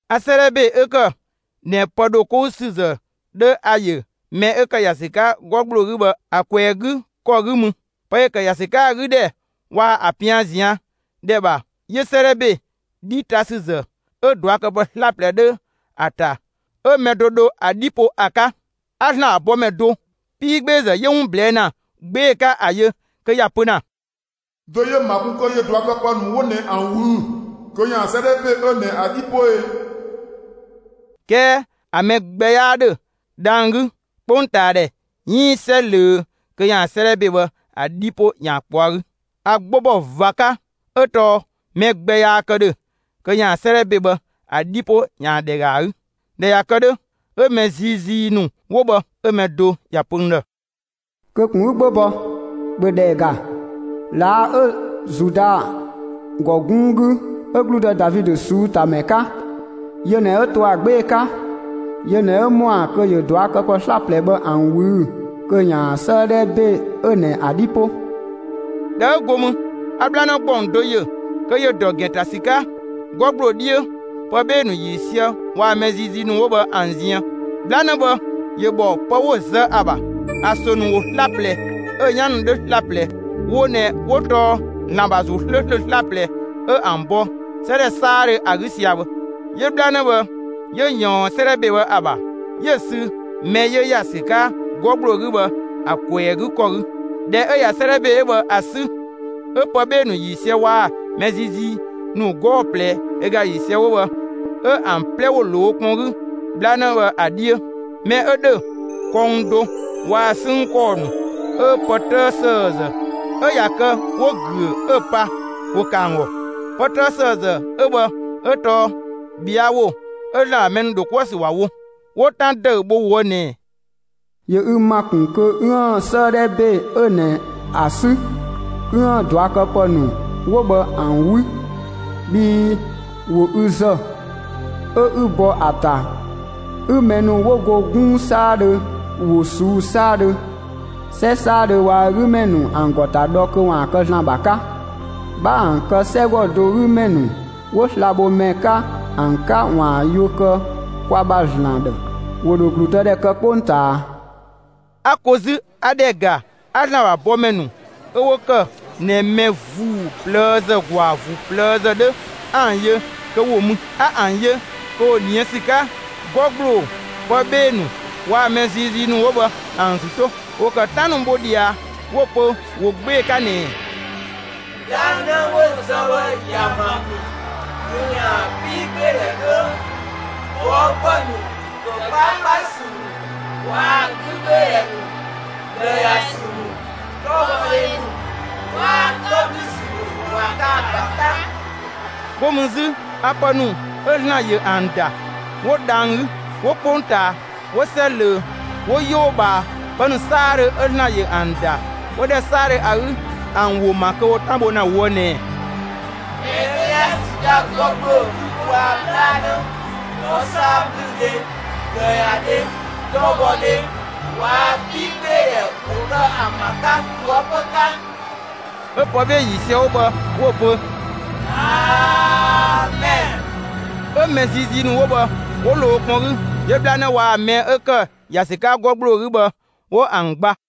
A 'sëëdhɛ ‑be 'ö ‑kë ꞊nɛ pë ‑dho 'kou ‑sü ‑zë 'dhö ‑a ‑yö mɛ 'ö ‑kë ‑ya ‑sü 'ka 'gɔ ‑gbloo 'gü bhë ‑a ꞊kwɛɛ‑ 'gü ‑kɔ 'gü mü. Pë ‑yö ‑kë ‑ya ‑sü 'ka ‑a 'gü ‑dhɛ waa‑ ‑a 'pian ꞊zian' ‑dhɛ ‑bha, 'yö 'sëëdhɛ ‑be 'dhi ta ‑sü ‑zë 'ö ꞊duakëpë 'slaplɛ 'dhö ‑a ‑ta ('ö mɛ do dho ‑a 'dhi po) ‑a 'ka. 'A ‑Zlan ‑bha bɔmɛ do 'piigbeezë 'yö 'wun ꞊blɛɛ' ‑na 'gbee‑ 'ka ‑a yö kö ‑ya pö ‑na: «Dö 'yö‑ ‑ma kun kö ‑yö ꞊duakëpë ‑nu 'wo ꞊nɛ ‑an ꞊wüü'‑ kö ‑yaan 'sëëdhɛ ‑be 'ö ꞊nɛ ‑a 'dhi 'po e?» 'Kɛɛ ‑a ‑mɛ gbɛ 'yaa ‑dhö, dhang‑ 'gü, 'kpongtaadhɛ, 'iin 'sɛ ꞊löö kö ‑yaan 'sëëdhɛ ‑be bhë ‑a 'dhi 'po ‑yaan ꞊kpɔɔ'‑ ‑a 'gü. A 'gbo ‑bɔ ꞊va 'ka 'ö tɔɔ mɛ gbɛ yaa kë ‑dhö kö ‑yaan 'sëëdhɛ ‑be bhë ‑a 'dhi 'po ‑yaan ‑dhɛ ‑ga ‑a 'gü. ꞊Dhɛ ꞊ya kë 'dhö, 'ö mɛ ziizii ‑nu 'wo bhë 'ö‑ mɛ do ‑ya pö n ‑dhë: «Kö ꞊kun 'ü 'gbo bɔ! ‑Bhö ‑dhɛ ‑ga: ꞊Laa' 'ö Zuda ‑gɔ 'gunng 'gü, 'ö ‑gludë Davidö ꞊suutamɛ 'ka, yö ꞊nɛ 'ö 'to ‑a 'gbee‑ 'ka. Yö ꞊nɛ 'ö ‑mɔa kö ‑yö ꞊duakëpë 'slaplɛ bhë ‑an ꞊wüü'‑ kö ‑yaan 'sëëdhɛ ‑be 'ö ꞊nɛ ‑a 'dhi 'po.» ꞊Dhɛ 'ö go mü, 'a 'bhlanë ‑gbɔng do yö kö ‑yö ‑dɔ ‑gɛn ‑ta ‑sü 'ka 'gɔ ‑gbloo 'dhiö pë 'bhee‑ ‑nu ‑yiisië waa‑ mɛ ziizii ‑nu 'wo bhë ‑an ziën. 'Bhlanë bhë ‑yö ‑bhɔ pë 'wo‑ zë ‑a ‑bha. ‑A ‑sö ‑nu ‑wo 'slaplɛ, 'ö‑ 'yan ‑nu 'dhö 'slaplɛ; wo ꞊nɛ 'wo tɔɔ ‑Zlan ‑bha ‑Zuu ('slööslö) 'slaplɛ 'ö ‑an bɔ 'sɛ ‑dhɛ 'saadhö ‑a 'gü sia‑ bhë. 'Yö 'bhlanë bhë 'yö ‑yɔɔn 'sëëdhɛ ‑be bhë ‑a ‑bha, 'yö‑ sü mɛ 'yö ‑ya ‑sü 'ka 'gɔ ‑gbloo 'gü bhë ‑a ꞊kwɛɛ‑ 'gü ‑kɔ 'gü. ꞊Dhɛ 'ö ‑ya 'sëëdhɛ ‑be 'ö bhë ‑a 'sü, 'ö pë 'bhee‑ ‑nu ‑yiisië waa‑ mɛ ziizii ‑nu 'gɔɔ‑ ꞊plɛ ö ga ‑yiisië 'wo bhë 'ö ‑an 'plɛ ‑wo ‑lo wo kpɔn 'gü 'bhlanë bhë ‑a 'dhiö. Mɛ 'ö ‑dhö kɔng do, waa‑ 'sënng ‑kɔɔ ‑nu 'ö pë 'tëë ‑sëëzë 'ö ‑ya kë 'wo‑ ‑güö 'ö‑ pa ‑wo kë ‑an ‑gɔ. Pë 'tëë ‑sëëzë 'ö bhë 'ö tɔɔ ꞊bhɛa' ‑wo 'ö ‑Zlan ‑bha mɛ ‑nu ‑dho 'kuë‑ ‑sü ‑wa wo. 'Wo 'tan ‑dëü bho ꞊woë' ꞊nɛ: «‑Yö ü ‑ma ‑kun kö 'üën‑ 'sëëdhɛ ‑be 'ö ꞊nɛ ‑a 'sü, 'üën‑ ꞊duakëpë ‑nu 'wo bhë ‑an 'wü. Bhii ‑wo ü ‑zë, 'ö 'ü bɔ ‑a ‑ta 'ü mɛ ‑nu 'wo go 'gunng 'saadhö, ‑wo ꞊suu'‑ 'saadhö, 'sɛ 'saadhö waa‑ ö 'gü ‑mɛ ‑nu ‑an ‑gɔ ‑ta dhɔ kö ‑waan kë ‑Zlan ‑bha 'ka. 'Bha ‑an kë 'sɛgɔ do 'gü ‑mɛ ‑nu 'wo slabhomɛ 'ka ‑an 'ka ‑waan yuö kë kwa ‑bha ‑Zlan ‑dhë; ‑wo ‑dho ‑gludëdhɛ kë 'kpongtaa.» 'A ko 'zü 'a ‑dhɛ ‑ga; 'a ‑Zlan ‑bha bɔmɛ ‑nu 'ö 'wo ‑kë ꞊nɛ mɛ ‑vuu ꞊plëëzë ‑gwaa ‑vuu ꞊plëëzë 'dhö ‑an yö kö ‑wo mü. A ‑an ‑yö kö ‑wo ꞊nië' ‑sü 'ka 'gɔ ‑gbloo, pë 'bhee‑ ‑nu waa‑ mɛ ziizii ‑nu 'wo bhë ‑an ‑zü 'to. ‑Wo ‑kë 'tan ‑nu bho ꞊dhia 'wo‑ pö ‑wo 'gbee‑ 'ka ꞊nɛɛ: «'Bhlanë 'wo‑ zë bhë ‑ya ‑ma ‑kun kö ‑yaan 'piigbeedhɛ 'dhö, ꞊bhɔɔpë ‑nu, ‑kë 'kpaakpasü ‑nu waa‑ 'gügbeedhɛ ‑nu, ꞊bhlëyasü ‑nu, 'tɔbhɔdhe ‑nu waa‑ 'tɔblüsü ‑nu ‑waan kë ‑a ‑bha 'ka.» 'Go mü 'zü a pë ‑nu 'ö ‑Zlan ‑yö ‑an ‑da, 'wo dhang‑ 'gü, 'wo 'kpongtaa, 'wo 'sɛ ꞊löö, 'wo 'yoo ꞊bhaa, pë ‑nu 'saadhö 'ö ‑Zlan ‑yö ‑an ‑da 'wo ‑dhɛ 'saadhö ‑a 'gü, ‑an ‑wo ‑ma kö ‑wo 'tan bho ‑na ꞊woë' ꞊nɛɛ: «Mɛ 'ö ‑ya ‑sü 'ka 'gɔ ‑gbloo 'gü waa‑ 'bhlanë, 'tɔsaablüdhe, ꞊bhlëyadhe, 'tɔbhɔdhe waa‑ 'piigbeedhɛ ‑wo kë ‑an ‑bha 'ka ꞊toëpö 'ka.» 'Ö pë 'bhee‑ ‑yiisië 'wo bhë 'wo‑ pö: «Amɛn.» 'Ö mɛ ziizii ‑nu 'wo bhë 'wo ‑lo wo kpɔn 'gü, ('yö 'bhlanë waa‑ mɛ 'ö ‑kë ‑ya ‑sü 'ka 'gɔ ‑gbloo 'gü bhë,) 'wo ‑an gba.